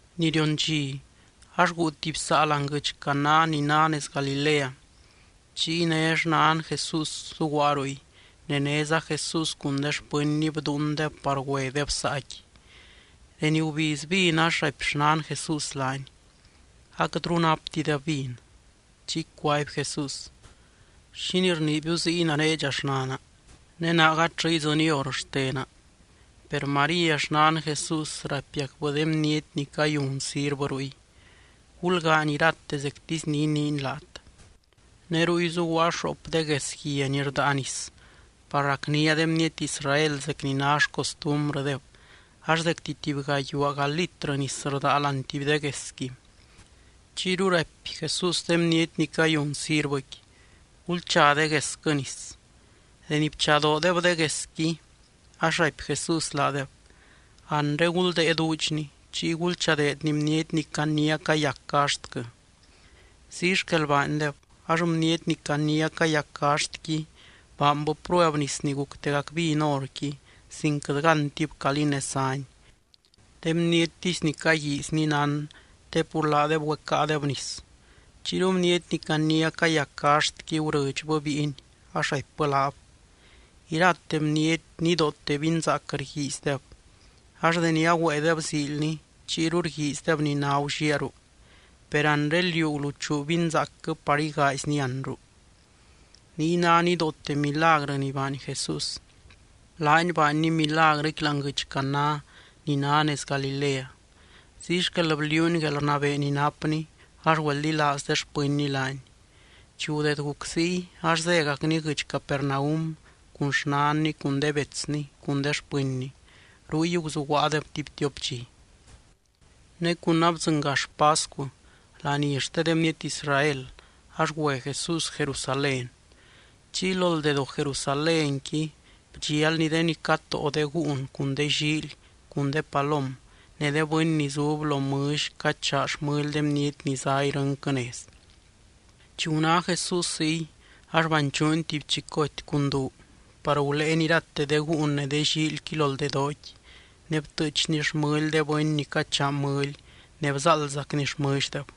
Ni rion dxi, ax guu tuby saa láani guɨdx Caná ni ná nez Galilea. Chiy né xnan Jesús zuguaa ruy, ne néza Jesús cun de xpɨnny bdúundeb par güedeb saaqui. Deni gubiz vin ax raipy xnan Jesús laany: —Aquɨtru ráptideb vin. Chiy cuaby Jesús: —¿Xínii rniibiu ziy nare dxa, xnana? Ne naa gatllɨ idzɨny hor xtena. Per María xnan Jesús raipiacbɨ de bniety ni cayun sirvɨ ruy: —Gulgaany irate zectisy ni iniiny laat. Ne ruy zuguaa xoop de gues guia ni rdaa nis par racnia de bniety Israel zec ni ná xcostumbrɨdeb ax zecti tuby gayuaaga litrɨ nis rdaa láani tuby de guesqui. Chiyru raipy Jesús de bniety ni cayun sirvɨqui: —Gulcha de guesquɨ nis. Deni bchadoodeb de guesqui, ax raipy Jesús laadeb: —Anre guldée duudxni, chiy gulchadeedni bniety ni caniá cayac gaxtquɨ. Ziy xquel baandeb. Ax bniety ni caniá cayac gaxtqui baanbɨ prueb nis ni guctegac vin horqui, sin quɨt gántib calí nez záni. De bniettisy ni caguiizni nán, te pur laadeb güecáadeb nis. Chiyru bniety ni caniá cayac gaxtqui gurɨdxbɨ bíiny ax raipbɨ laab: —Irate bniety nidoote vinzaac rguiizdeb, ax deni agüéedeb ziilni, chiyru rguiizdeb ni ná gulliaaru. Per anre liú guluchuu vinzaacquɨ par igaaizni anru. Niy ná nidoote milagrɨ ni baany Jesús. Laany baanny milagrɨqui láani guɨdx Caná ni ná nez Galilea. Ziy xquel bliuuny guelrnabee ni napny ax güeldilaaz de xpɨnny laany. Chi gudeed guc ziy ax zégacny guɨdx Capernaum cun xnanny cun de betsny cun de xpɨnny. Ruy guzuguaadeb tuby tiop dxi. Ne cun abdzɨngax pascu, laní xte de bniety Israel, ax güe Jesús Jerusalén. Chiy lo ldedoo Jerusalénqui bdxialny de ni catóo de gúun cun de llíily cun de palom ne de bɨny ni zub lo mɨlly cachaa xmɨly de bniety ni zá irɨnquɨ nez. Chi guná Jesús ziy ax banchuuny tuby chicoty cun duu par guléeny irate de gúun ne de llíilyqui lo ldedooqui ne btɨɨchny xmɨly de bɨny ni cachaa mɨly ne bzáaldzacny xmɨlldeb.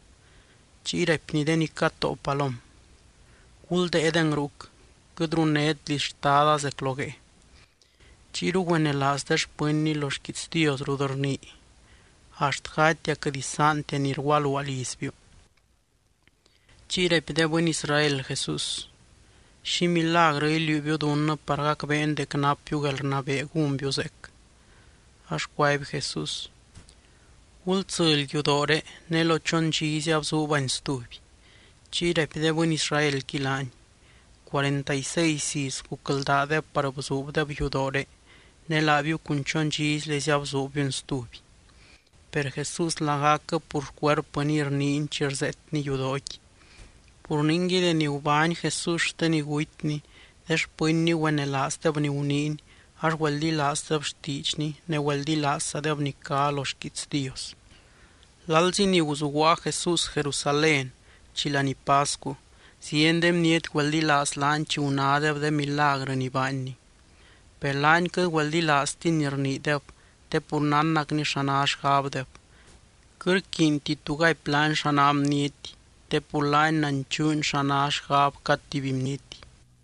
Chiy raipny de ni catóo palom: —¡Guldée deng ruc! ¡Quɨt runnét liz Xtada zec lo guee! Chiyru güenelaaz de xpɨnny lo xquiits Dios rut rnii: “Axt gatia quɨt isaantia ni rgualuaa lizbiu.” Chiy raipy de bɨny Israel Jesús: —¿Xi milagrɨ iliuubiu dunnɨ par gacbeen dec napbiu guelrnabee gúnbiu zeec? Ax cuaby Jesús: —Gultsɨly yudooré ne lo chon dxizy abzuubani stuby. Chiy raipy de bɨny Israelqui laany: —Cuarenta y seis iz gucldaadeb par bzuubdeb yudooré. Ne laabiu cun chon dxizylezy abzuubbiuni stuby. Per Jesús lagacquɨ pur xcuerpɨniy rniiny chi rzeetny yudooqui. Pur ningui, deni gubány Jesús xte ni gutyny de xpɨnny güenelaazdeb ni guniiny, ax güeldilaazdeb xtiidxny ne güeldilaazzadeb ni cá lo xquiits Dios. Lalzi ni guzuguaa Jesús Jerusalén, chi laní pascu, zieny de bniety güeldilaaz laany chi gunádeb de milagrɨ ni baanny. Per laany quɨt güeldilaaztiny ni rniideb te pur nánnacny xa ná xgabdeb. Quɨt rquiinti tu gaipy laany xa ná bniety te pur laany nanchuuny xa ná xgab cad tuby bniety.